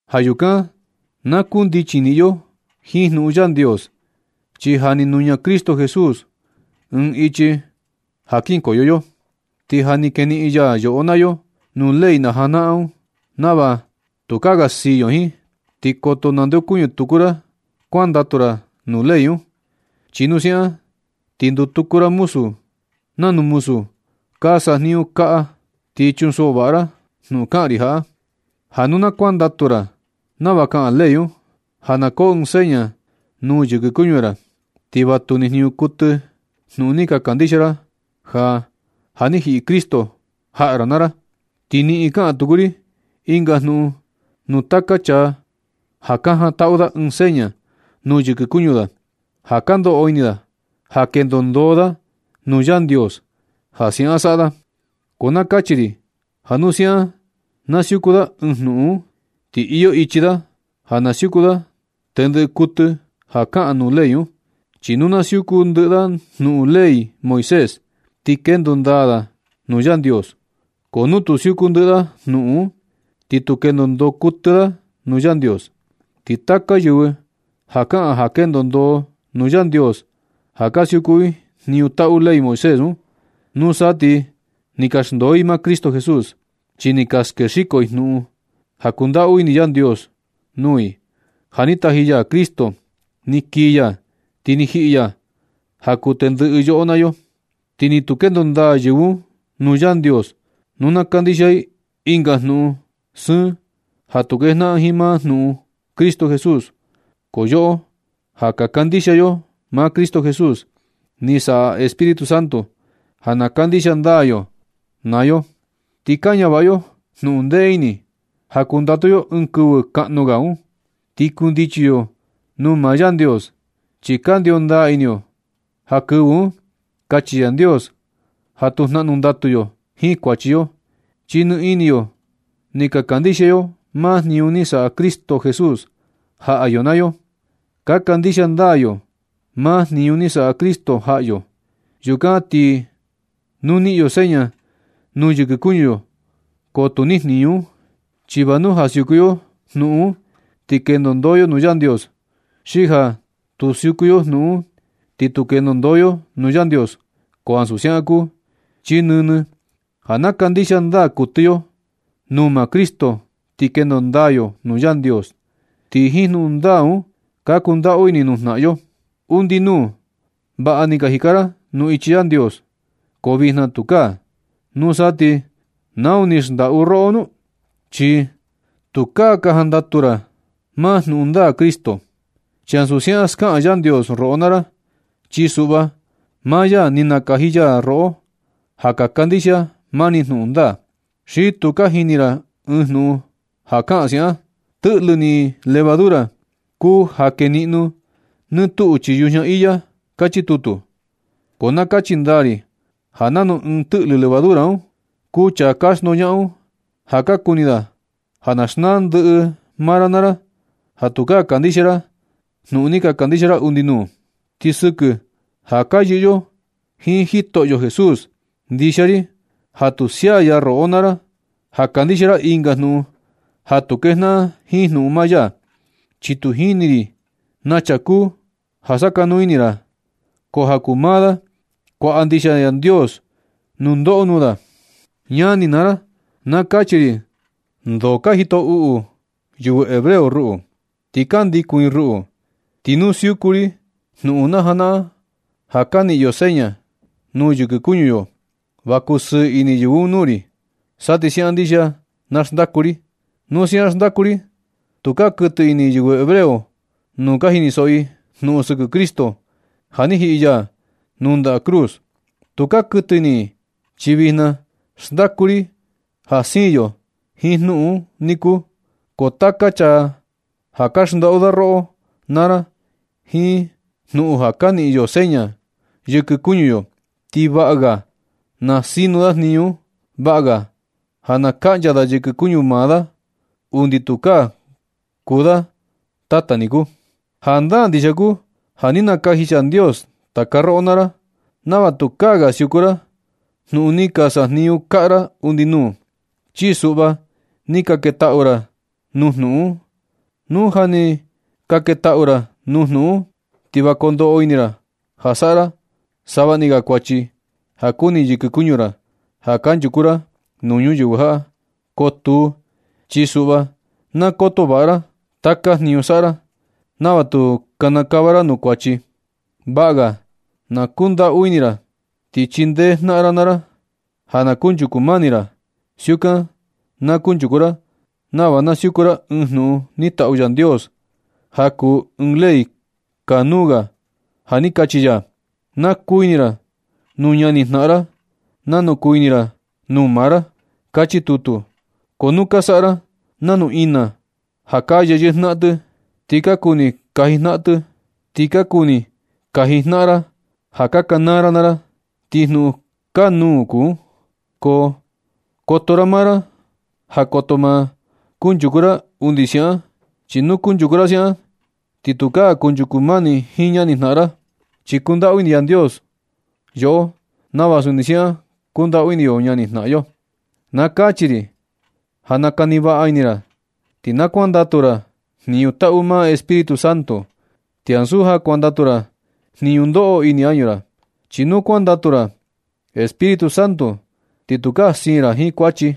Ja yukan na kundichi niꞌin yo jiin jnuꞌun Yandios, chi ja ni nuña Cristo Jesús ɨɨn ichi ja kinkoyo yo, ti ja ni keniꞌin ya yoꞌo naa yo nuu ley najanaꞌan un, nava tukaa ga siin yo jiin. Ti koto nandeokuñɨ tuku ra kuandatu ra nuu ley un, chi nu siaꞌan ti nduu tuku ra nanu muzu ka sajniñu kaꞌa. Ti chunsoꞌo vaꞌa ra jnuꞌun kaꞌan ri jaꞌa, ja nu na kuandatu ra nava kaꞌan ley un, ja na koo ɨɨn seña nuu yɨkɨ kuñu ra, ti va tu nijniñu kuɨtɨ jnuꞌun ni kandixia ra, ja ja ni jiꞌi Cristo jaꞌa ra naa ra. Ti niꞌin kaꞌan tuku ri ɨnga jnuꞌun nuu taka chaa ja ka jantaꞌu da ɨɨn seña nuu yɨkɨ kuñu da, ja ka ndoꞌo ini da ja kendo ndoo da nuu Yandios ja siaꞌan saꞌa da. Ko na kachi ri ja nu siaꞌan na siuku da ɨɨn jnuꞌun un, ti iyo ichi da ja na siuku da tendɨ kuɨtɨ ja kaꞌan nuu ley un. Chi nu na siuku ndɨꞌɨ da jnuꞌun ley Moisés, ti kendo ndaa da nuu Yandios. Ko nu tu siuku ndɨꞌɨ da jnuꞌun un, ni tu kendo ndoo kuɨtɨ da nuu Yandios. Ti taka yɨvɨ ja kaꞌan ja kendo ndoo nuu Yandios ja ka siuku i jniñu taꞌu ley Moisés un, nusa ti ni ka xndoo i maa Cristo Jesús, chi ni ka skexiko i jnuꞌun ja kundaꞌu ini Yandios nuu i, ja ni taji ya Cristo ni kii ya, ti ni jiꞌi ya ja kuu tendɨꞌɨ yo naa yo. Ti ni tu kendo ndaa yɨvɨ un nuu Yandios nu na kandixia i ɨnga jnuꞌun sɨɨn ja tu kejnaꞌan jiin maa jnuꞌun Cristo Jesús. Ko yoꞌo ja ka kandixia yo maa Cristo Jesús, ni saꞌa Espíritu Santo ja na kandixia ndaa yo naa yo. Ti ka ñavaꞌa yo jnuꞌun ndee ini ja kundatu yo ɨɨn kɨvɨ kaꞌnu ga un, ti kundichi yo nuu maa Yandios. Chi kandio ndaa ini yo ja kɨvɨ un kachi Yandios ja tu jnaꞌnu ndatu yo jiin kuachi yo, chi ni ini yo ni ka kandixia yo maa jniñu ni saꞌa Cristo Jesús jaꞌa yo naa yo. Ka kandixia ndaa yo maa jniñu ni saꞌa Cristo jaꞌa yo. Yukan ti nu niꞌin yo seña nuu yɨkɨ kuñu yo, ko tu nijniñu un. Chi va nu ja siuku yo jnuꞌun un ti kendo ndoo yo nuu Yandios, xi ja tu siuku yo jnuꞌun un, ti tu kendo ndoo yo nuu Yandios, ko ansu siaꞌan kuu. Chi nɨnɨ ja na kandixia ndaa kuɨtɨ yo nuu maa Cristo ti kendo ndaa yo nuu Yandios. Ti jiin jnuꞌun ndaa un ka kundaꞌu ini nuu jnaꞌan yo. Undi nuu, vaꞌa ni ka jika ra nuu ichi Yandios, ko vijna tukaa. Nusa ti ¿nau ni xndaꞌu roꞌo nu? Chi tukaa ka jandatu ra maa jnuꞌun ndaa Cristo. Chi ansu siaꞌan skaꞌan Yandios roꞌo naa ra. Chi suꞌva, maa ya ni nakaji ya roꞌo ja ka kandixia mani jnuꞌun ndaa. Xi tu ka jini ra ɨɨn jnuꞌun ja kaꞌan siaꞌan: “Tɨꞌlɨ ni levadura kuu ja keniꞌno nɨ tuꞌu chii yujña iya”, kachi tutu. Ko na kachi ndaa ri ja nanu ɨɨn tɨꞌlɨ levadura un kuu chaa ka xndoñaꞌan un, ja ka kuni da ja na xnaa ndɨꞌɨ maa ra naa ra, ja tukaa kandixia ra jnuꞌun ni ka kandixia ra undi nuu. Ti sɨkɨ ja ka yɨꞌɨ yo jiin Jitoꞌyo Jesús, ndixia ri ja tu sia ya roꞌo naa ra ja kandixia ra ɨnga jnuꞌun ja tu kejnaꞌan jiin jnuꞌun maa ya. Chi tu jini ri naa chaa kuu ja sakanuu ini ra naa ra un, ko ja kuu maa da kuaꞌa ndixia Yandios nundoꞌo nuu da. Ñani naa ra, na kachi ri ndo ka jito uꞌu yɨvɨ hebreo ruꞌu, ti ka ndikun i ruꞌu. Ti nu siuku ri jnuꞌun najanaꞌan ja ka niꞌin yo seña nuu yɨkɨ kuñu yo, va kusɨɨ ini yɨvɨ un nuu ri, sa ti siaꞌan ndixia na xndaku ri. Nu siaꞌan xndaku ri, tukaa kuɨtɨ ini yɨvɨ hebreo nu ka jinisoꞌo i jnuꞌun sɨkɨ Cristo ja ni jiꞌi ya nuu ndaꞌa cruz. Tukaa ka kuɨtɨ ini i, chi vijna xndaku ri ja siin yo jiin jnuꞌun un niku. Ko taka chaa ja ka xndaꞌu da roꞌo naa ra jiin jnuꞌun ja ka niꞌin yo seña yɨkɨ kuñu yo, ti vaꞌa ga na sinu da jniñu un. Vaꞌa ga ja na kaꞌncha da yɨkɨ kuñu maa da undi tukaa kuu da tata niku. Jandaa ndixia kuu ja ni nakaji Yandios taka roꞌo naa ra nava tukaa ga siuku ra jnuꞌun ni ka sajniñu kaꞌa ra undi nuu. Chi suꞌva ni ka ketaꞌu ra nuu jnuꞌun un. Nu ja ni ka ketaꞌu ra nuu jnuꞌun un, ti va kondoꞌo ini ra ja saꞌa ra savaꞌni ga kuachi ja kuni yɨkɨ kuñu ra ja kanchuku ra nuu ñuyɨvɨ jaꞌa. Ko tuu, chi suꞌva na koto vaꞌa ra taka jniñu saꞌa ra nava tu kinikava ra nuu kuachi. Vaꞌa ga na kuꞌun ndaꞌu ini ra, ti chindee jnaꞌan ra naa ra ja na kunchuku mani ra. Siukan na kunchuku ra nava na siuku ra ɨɨn jnuꞌun ni taꞌu Yandios ja kuu ɨɨn ley kanuu ga ja ni kachi ya: “Na kuu ini ra nuu ñani jnaꞌan ra nanu kuu ini ra nuu maa ra”, kachi tutu. Ko nu ka saꞌa ra nanu ina ja ka yeyɨꞌɨ jnaꞌan, ti ka kuni kaji jnaꞌan ra ja ka kanaa ra naa ra, ti jnuꞌun kanuu kuu un. Ko koto ra maa ra ja koto ma kunchuku ra undi siaꞌan. Chi nu kunchuku ra siaꞌan, ti tukaa kunchuku mani jiin ñani jnaꞌan ra. Chi kundaꞌu ini Yandios yoꞌo nava suni siaꞌan kundaꞌu ini yo ñani jnaꞌan yo. Na kachi ri ja na kani vaꞌa ini ra ti na kuandatu ra jniñu taꞌu maa Espíritu Santo, ti ansu ja kuandatu ra jniñu ndoꞌo ini añu ra. Chi nu kuandatu ra Espíritu Santo, ti tukaa siin ra jiin kuachi.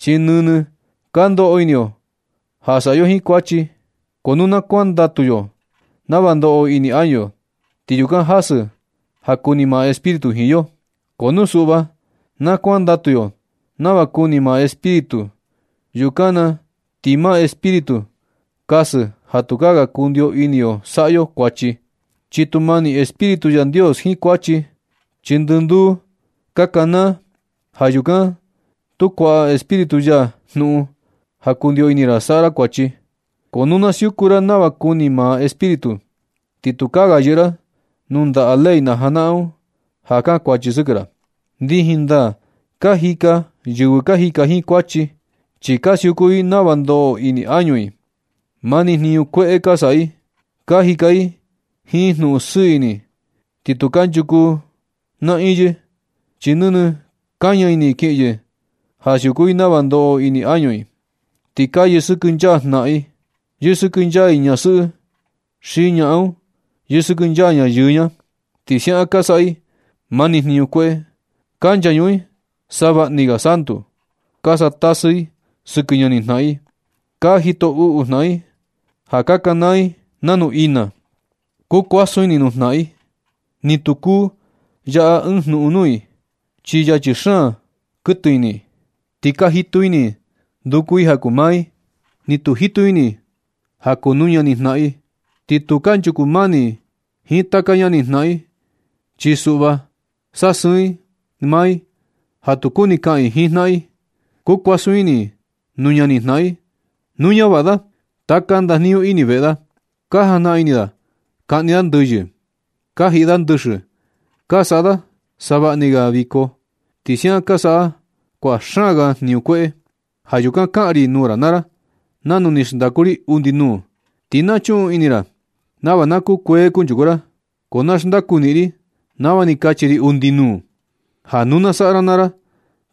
Chi nɨnɨ ka ndoꞌo ini yo ja saꞌa yo ɨɨn kuachi. Ko nu na kuandatu yo nava ndoꞌo ini añu yo, ti yukan jasɨ ja kuni maa Espíritu jiin yo. Ko nu suꞌva na kuandatu yo nava kuni maa Espíritu, yukan na ti maa Espíritu kasɨ ja tukaa ga kundio ini yo saꞌa yo kuachi. Chi tu mani Espíritu Yandios jiin kuachi, chi ndɨ nduu ka kanaa. Ja yukan tu kuaꞌa Espíritu ya jnuꞌun ja kundio ini ra saꞌa ra kuachi. Ko nu na siuku ra nava kuni maa Espíritu, ti tukaa ga yɨꞌɨ ra nuu ndaꞌa ley najanaꞌan un ja kankuachi sɨkɨ ra. Ndijin ndaa ka jika yɨvɨ ka jika jiin kuachi, chi ka siuku i nava ndoꞌo ini añu i. Mani jniñu kueꞌe ka saꞌa i. Ka jika i jiin jnuꞌun sɨɨ ini ti tu kanchuku naꞌiin yɨ, chi nɨnɨ kaña ini kiꞌin yɨ ja siuku i nava ndoꞌo ini añu i. Ti ka yɨsɨkɨnchaa jnaꞌan i, yɨsɨkɨnchaa i ñasɨꞌɨ i xi ñaꞌan un yɨsɨkɨnchaa ña yɨɨ ña. Ti siaꞌan ka saꞌa i mani jniñu kueꞌe. Ka nchañuꞌun i savaꞌni ga santu. Ka saꞌa tasɨ i sɨkɨ ñani jnaꞌan i. Ka jito uꞌu jnaꞌan i ja ka kanaa i nanu ina. Kuu kuasun ini nuu jnaꞌan i. Ni tu kuu yaꞌa ɨɨn jnuꞌun nuu i, chi yachi xaan kuɨtɨ ini i. Ti ka jitu ini i nduku i ja kuu maa i, ti tu jitu ini i ja kuu nuu ñani jnaꞌan i. Ni tu kanchuku mani i jiin taka ñani jnaꞌan i, chi suꞌva sasɨɨn i maa i ja tu kuni kaꞌan i jiin jnaꞌan i. Kuu kuasun ini i nuu ñani jnaꞌan i nu ñavaꞌa da taka ndajniñu ini veꞌe da. Ka jajnaꞌan ini i kaꞌni i ndɨyɨ. Ka jiꞌi yɨ ndɨxɨ, ti ka saꞌa i savaꞌni ga viko. Ti siaꞌan ka saꞌa i kuaꞌa xaan ga jniñu kueꞌe. Ja yukan kaꞌan ri nuu ra naa ra nanu ni xndaku ri undi nuu, ti na chuꞌun ini ra nava na kukuee kunchuku ra. Ko na xndaku niꞌin ri nava ni kachi ri undi nuu, ja nu na saꞌa ra naa ra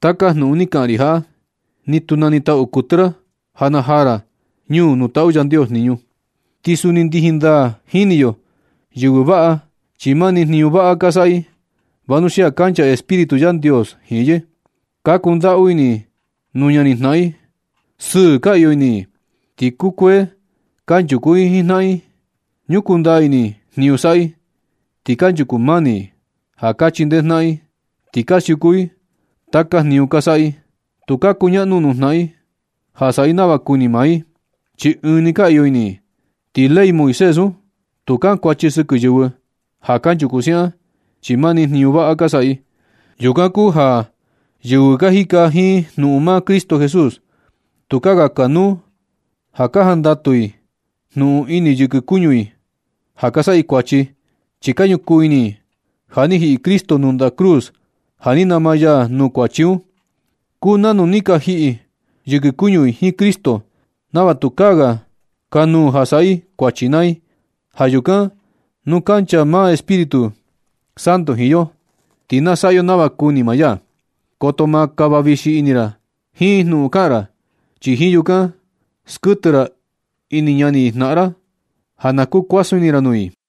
taka jnuꞌun ni kaꞌan ri jaꞌa, ni tu na nitaꞌu kuɨtɨ ra ja najaa ra ñuu nuu taꞌu Yandios jniñu. Ti suni ndijin ndaa jini yo yɨvɨ vaꞌa chi mani jniñu vaꞌa ka saꞌa i, vanuxia kancha Espíritu Yandios jiin yɨ. Ka ñundaꞌu ini i nuu ñani jnaꞌan i. Sɨɨ ka iyo ini i, ti kukuee kanchuku i jiin jnaꞌan i. Ñukuu ndaa ini i jniñu saꞌa i. Ti kanchuku mani i ja ka chindee jnaꞌan i. Ti ka siuku i taka jniñu ka saꞌa i. Tu ka kuñaꞌnu nuu jnaꞌan i ja saꞌa i nava kuni maa i, chi ɨɨn nuu ka iyo ini i. Ti ley Moisés un, tu kankuachi sɨkɨ yɨvɨ ja kanchuku siaꞌan, chi mani jniñu vaꞌa ka saꞌa i. Yukan kuu ja yɨvɨ ka jika jiin jnuꞌun maa Cristo Jesús, tukaa ga kanuu ja ka jandatu i jnuꞌun ini yɨkɨ kuñu i ja ka saꞌa i kuachi. Chi ka ñukuu ini i ja ni jiꞌi Cristo nuu ndaꞌa cruz ja ni nama ya nuu kuachi un. Kuu nanu ja ni ka jiꞌi yɨkɨ kuñu i jiin Cristo, nava tukaa ga kanuu ja saꞌa i kuachi naa i. Ja yukan nu kancha maa Espíritu Santo jiin yo, ti na saꞌa yo nava kuni maa ya. Koto ma kava vixi ini ra jiin jnuꞌun kaꞌan ra, chi jiin yukan skuɨtɨ ra ini ñani jnaꞌan ra ja na kuu kuasun ini ra nuu i.